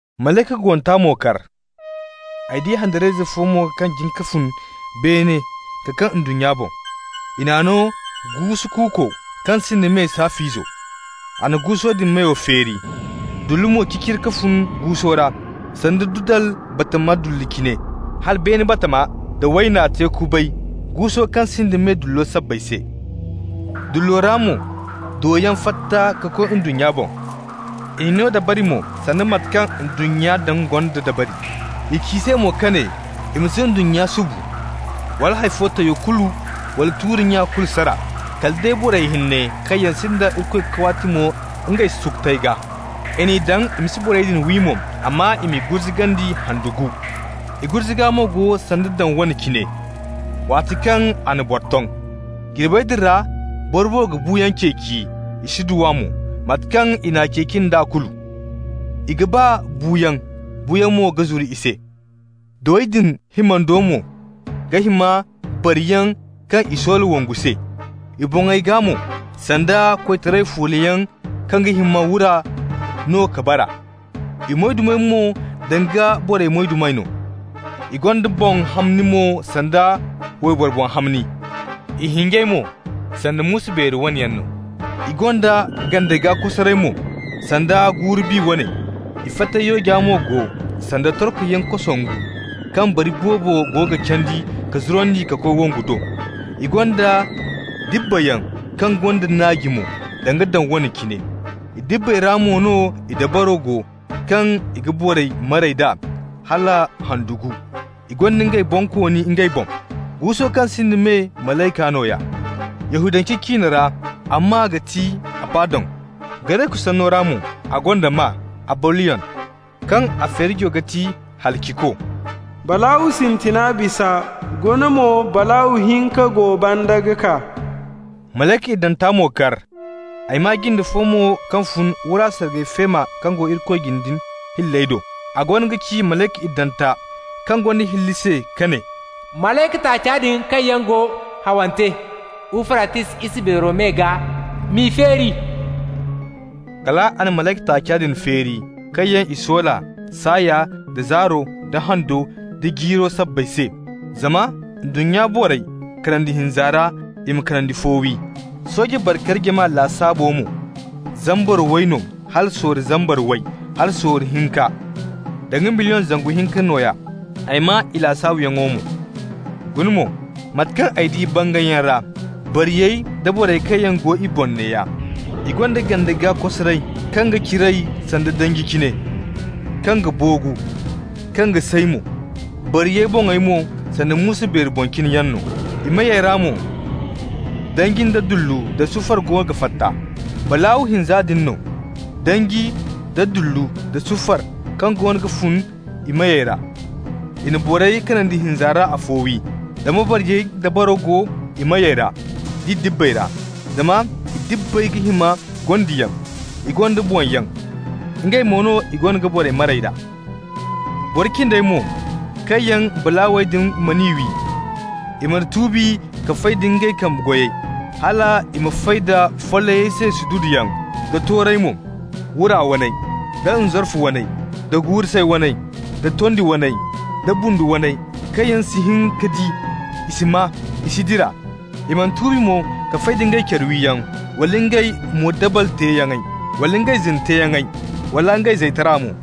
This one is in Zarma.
Malayka guwanta mo kar. Ay di handariyayze fo mo kaŋ jin ka fun beene ka kaŋ ndunnya boŋ. I n'a no guusu kuuko kaŋ sinda me saaf'izo. A na guuso din meyo feeri. Dullu mo ciciri ka fun guuso ra, sanda dudal bambata dullu cine, hala beene batama nda wayna te kubay guuso kaŋ sinda me dullo sabbay se. Dullo ra mo doyaŋ fatta ka koy ndunnya boŋ. I n'i no dabari mo sanda mate kaŋ ndunnya daŋ gonda dabari. I ci i se mo ka ne i ma si ndunnya subu, wala hay fo tayo kulu wala tuuri nya kulu sara. Kala day borey hinne kaŋ yaŋ sinda Irikoy kawaatimo ngey sukutey gaa. I n'i daŋ i ma si borey din wi mo, amma i m'i gurzugandi handu gu. I gurzuga mo go sanda daŋ wane cine, waati kaŋ a na boro ton. Jirbey din ra borey ga buuyaŋ ceeci, i si du a mo, mate kaŋ i n'a ceeci nd'a kulu. I ga ba buuyaŋ, buuyaŋ mo ga zuru i se. Dowey din himandi mo ga hima bariyaŋ kaŋ i soola wongu se. I boŋey gaa mo, sanda koytaray fuulayaŋ kaŋ ga hima wura no ka bara. I moydumey mo danga borey moyduma no. I gonda boŋ hamni mo sanda wayboro boŋ hamni. I hinjey mo sanda muusu beeri wane yaŋ no. I gonda ganda gaa kosaray mo, sanda guuru-bi wane. I fatey yooja mo go sanda torkoyaŋ kosongu kaŋ bari boobo go ga candi ka zurandi ka koy wongu do. I gonda dibbayaŋ kaŋ gonda naaji mo danga daŋ wane cine. I dibbey ra mo no i dabaro go kaŋ i ga borey maray d'a hala handu gu. I gonda ngey bonkooni ngey boŋ, guuso kaŋ sinda me malayka nooya. Yahudance ciine ra a maa ga ti Abadon. Gareku sanno ra mo a gonda maa Abolyon, kaŋ a feerijo ga ti Halaciko. Balaaw sintina bisa, guna mo balaaw hinka go banda ga kaa. Malayka iddanta mo kar. Ay maa jinde fo mo kaŋ fun wura sargay feema kaŋ go Irikoy jine din hilley do. A goono ga ci malayka iddanta kaŋ gonda hilli se ka ne: «Malayka taaca din kaŋ yaŋ go hawante Ufratis isa beero me gaa, m'i feeri.» Kal a na malayka taaca din feeri, kaŋ yaŋ i soola saaya nda zaaro nda hando nda jiiro sabbay se, zama ndunnya borey kanandi hinza ra i ma kanandi fo wi. Sooje bari-kari jama lasaabo mo, zambar way no hala sorro zambar way hala sorro hinka, (danga million zangu hinka nooya). Ay maa i lasaabuyaŋo mo. Guna mo, mate kaŋ ay di bangayyaŋ ra, bariyey da borey kaŋ yaŋ go i boŋ neeya: I gonda ganda gaa kosaray kaŋ ga ciray sanda danji cine, kaŋ ga boogu, kaŋ ga say mo. Bariyey boŋey mo, sanda muusu beeri boŋ cine yaŋ no. I meyey ra mo danji da dullu da sufar goono ga fatta. Balaaw hinza din do no, danji, da dullu nda sufar kaŋ goono ga fun i meyey ra, i na borey kanandi hinza ra afo wi. Zama bariyey dabaro go i meyey ra d'i dibbey ra. Zama i dibbey ga hima gondiyaŋ. I gonda boŋyaŋ. Ngey mo no i goono ga borey maray d'a. Boro cindey mo, kaŋ yaŋ balaawey din mana wi, i mana tuubi ka fay nda ngey kambe goyey, hal i ma fay da follayey se sududuyaŋ, da toorey mo, wura waney, da nzarfu waney, da guuru-say waney, da tondi waney, da bundu waney, kaŋ yaŋ si hin ka di, i si maa, i si dira. I mana tuubi mo ka fay nda ngey care wiyaŋ, wala ngey moodabal teeyaŋey, wala ngey zina teeyaŋey wala ngey zaytaray mo.